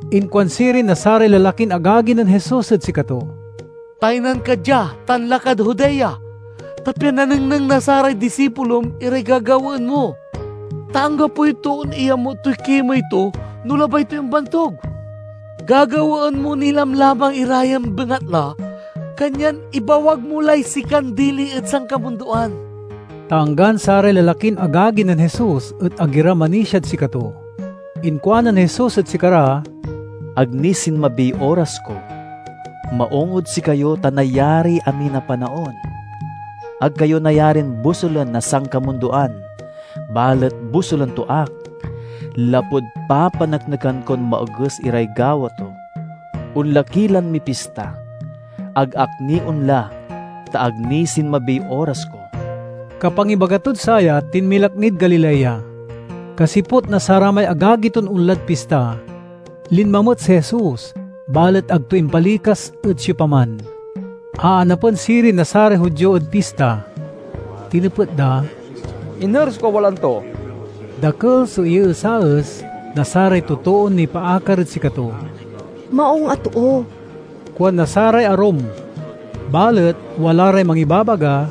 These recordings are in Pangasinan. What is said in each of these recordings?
Inkuan sirin na saray lalakin agagi nen Jesus ed sikato, "Taynan ka dia tan lakad Judea, ta pian nanengneng na saray disipulom iray gagawaen mo. Ta anggapoy toon iyamut toy kimey to no labay toy ombantug. Gagawaen mo ni lamlamang ira yan bengatla, kanyan ibawag mo lay sikan dili ed sankamundoan." (Ta anggan saray lalakin agagi nen Jesus et ag ira manisiad sikato.) Inkuanen Jesus ed sikara, "Ag ni sinmabiy oras ko. Maung ed sikayo ta nayariy amin a panaon. Ag kayo nayarin bosulen na sankamundoan balet bosulen to ak, lapud papaneknekan kon maoges iray gawa to. Onla ki lan mipista. Ag ak ni onla, ta ag ni sinmabiy oras ko." Kapangibaga tod saya tinmilak nid Galilea. Kasiput na saramay agagi ton onlad pista, linma met si Jesus, balet ag to impalikas ed siopaman. Aanapen sirin na saray Judio ed pista. Tinepet da, "Iner so kawalaan to?" Dakel so iyeesaes na saray totoon nipaakar ed sikato. "Maung a too," kuan na saray arum, balet wala ray mangibabaga,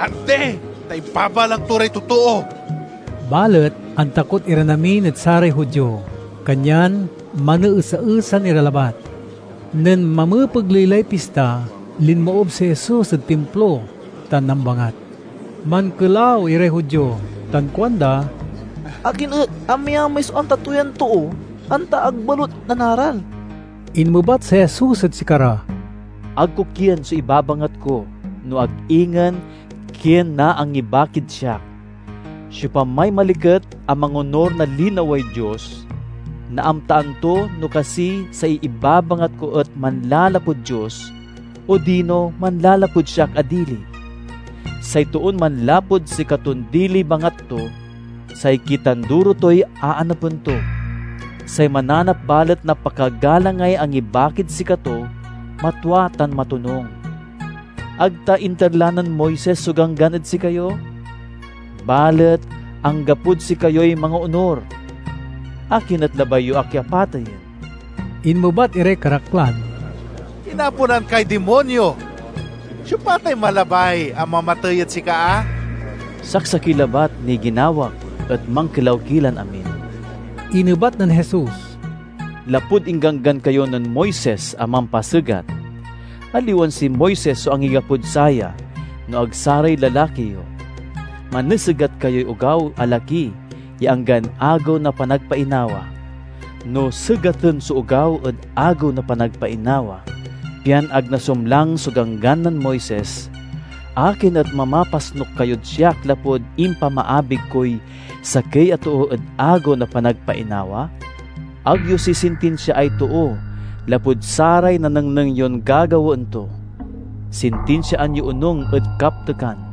"Andi, ta ibabalang to ray totoo." Balet antakot iran amin ed saray Judio, kanyan maneesaesan ira labat. Nen mamepegley lay pista, linmoob si Jesus ed Timplo tan nambangat. Mankelaw iray Judio tan kuanda, "Akin et amayamay so amta to yan too, anta ag balut nanaral?" Inmebat si Jesus ed sikara, "Ag ko kien so ibabangat ko, no ag ingen kien na angibakid siak. Siopamay maliket a mangonur na linaway Dios, naamtaan to no kasi say ibabangat ko et manlalapud Dios odino manlalapud siak a dili. Say toon manlapud sikaton diliy bangat to, say kitanduro toy aanapen to. Say mananap balet na pakagalangay angibakid sikato, matwa tan matonung. Ag ta inter la nen Moises so Ganggan ed sikayo? Balet anggapod sikayoy mangoonur. Akin et labay yo ak a pateyen?" Inmebat iray karaklan, "Inaponan kay dimonyo! Siopa tay malabay a mamatey ed sika a?" "Saksakey labat niy ginawak, et mankelaw ki lan amin," inebat nen Jesus. "Lapud ingganggan kayo nen Moises a mampasegat (aliwan si Moises so angigapod saya no ag saray lalaki yo), manesegat kayoy ogaw a laki ya anggan Agew na Panagpainawa. No segaten so ogaw ed Agew na Panagpainawa pian ag nasumlang so Ganggan nen Moises, akin et mamapasnuk kayod siak lapud impamaabig koy sakey a too ed Agew na Panagpainawa? Ag yo sisintinsiaay too lapud saray nanengneng yon gagawaen to; sintinsiaan yo onung ed kaptekan."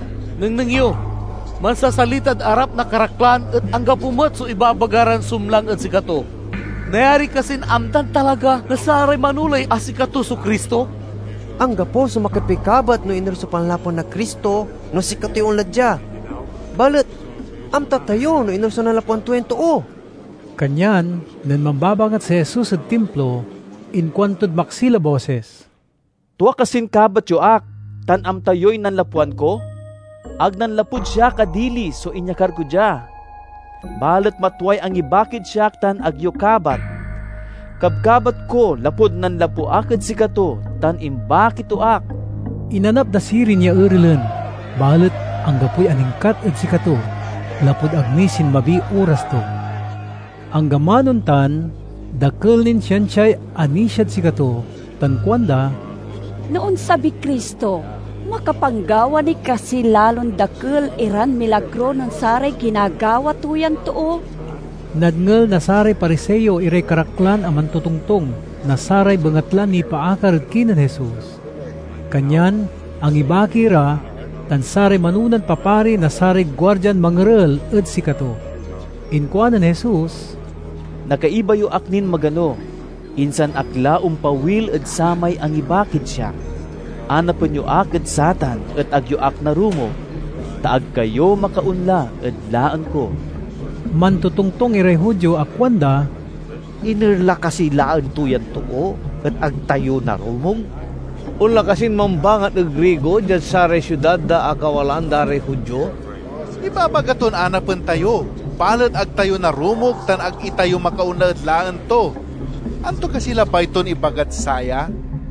Nengneng yo! Mansasalitad arap na karaklan et anggapo met so ibabaga ran sumlang ed sikato. Nayari kasin amtan talaga na saray manoley a sikato so Cristo? Anggapo so makapikabat no iner so panlapwan na Cristo no sikatoy onla dia. Balet amta tayo no iner so nanlapwan to yan too." Kanyan nen mambabangat si Jesus ed Timplo, inkuantod maksil a bosis, "Tua kasin kabat yo ak tan amta yoy nanlapwan ko? Ag nanlapud siak a dili so inyakar ko dia. Balet matway angibakid siak tan ag yo kabat. Kabkabat ko lapud nanlapu ak ed sikato tan imbaki to ak." Inanap da sirin ya erelen, balet anggapoy aningkat ed sikato lapud ag ni sinmabiy oras to. Anggaman ontan, dakel nin siansiay anisiad sikato tan kuanda, "No onsabiy Cristo, makapanggawa ni kasiy lalon dakel iran milagro nen saray ginagawa to yan too?" Nadngel na saray Pariseo iray karaklan a mantotongtong na saray bengatlan nipaakar ed kinen Jesus, kanyan angibaki ra tan saray manonan papari na saray guardian mangerel ed sikato. Inkuanen Jesus, "Nakaiba yo ak nin magano, insan ak la ompawil ed samay angibakid siak. Anapen yo ak ed satan et ag yo ak narumog, ta ag kayo makaonla ed laen ko." Mantotongtong iray Judio a kuanda, "Iner la kasiy laen to yan too et ag tayo narumog? Onla kasin mambangat ed Grigo diad saray siudad da a kawalaan da ray Judio? Ibabaga ton anapen tayo, balet ag tayo narumog tan ag itayo makaonla ed laen to. Anto kasiy labay ton ibagad saya?"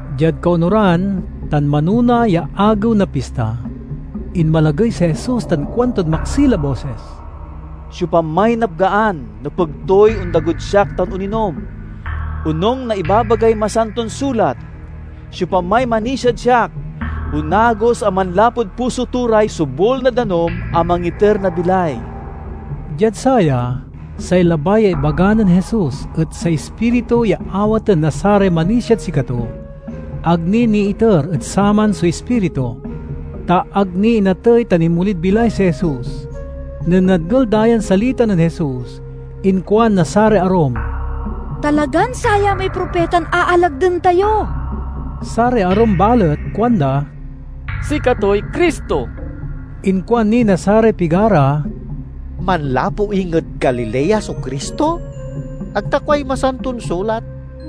Diad kaonuran tan manona ya agew na pista, inmalagey si Jesus tan kuantod maksil a bosis, "Siopamay napgaan nepeg toy ondagod siak tan oninom. Onung na ibabagay Masanton Sulat, 'Siopamay manisiad siak, onagos a manlapud puso to ray sobul na danum a mangiter na bilay.'" Diad saya, say labay ya ibaga nen Jesus et say Ispiritu ya awaten na saray manisiad sikato. Ag ni niiter ed saman so Ispiritu, ta ag ni inatey tan inmolid bilay si Jesus. Nen nadngel da yan salita nen Jesus, inkuan na saray arum, "Talagan saya may propitan aalagden tayo!" Saray arum balet kuanda, "Sikatoy Cristo!" Inkuan ni na saray pigara, "Manlapu inged Galilea so Cristo? Ag ta kuay Masanton Sulat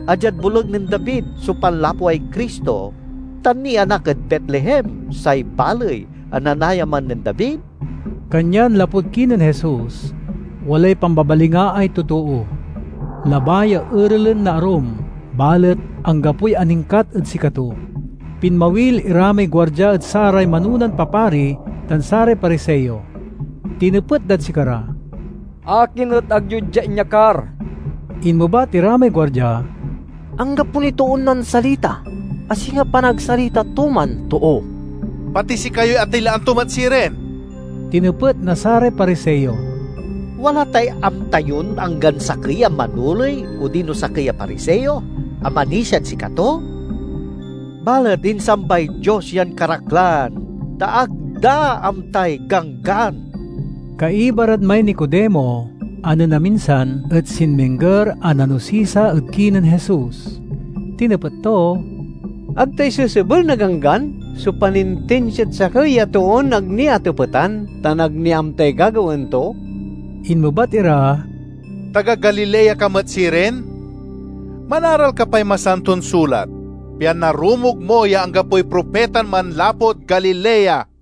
a diad boleg nen David so panlapway Cristo tan nianak ed Betlehem, say baley a nanayaman nen David?" Kanyan lapud kinen Jesus, walay pambabalingaay totoo. Labay ya erelen na arum, balet anggapoy aningkat ed sikato. Pinmawil ira may guardia ed saray manonan papari tan saray Pariseo. Tinepet dad sikara, "Akin et ag yo dia inyakar?" Inmebat ira may guardia, "Anggapo niy toon nansalita a singa panagsalita to man too!" "Pati sikayoy atilaan to met sirin?" tinepet na saray Pariseo. "Wala tay amta yon anggan sakey a manoley odino sakey a Pariseo a manisiad sikato? Balet insambay Dios yan karaklan ta ag da amtay Ganggan!" Kaiba rad may Nicodemo a nen aminsan et sinmingger a nanosisa ed kinen Jesus. Tinepet to, "Ag ta isesebel na Ganggan so panintinsiad sakey a toon ag ni atepetan tan ag ni amtay gagawaen to?" Inmebat ira, "Taga Galilea ka met sirin? Manaral ka pay Masanton Sulat, pian narumog mo ya anggapoy propitan manlapud Galilea."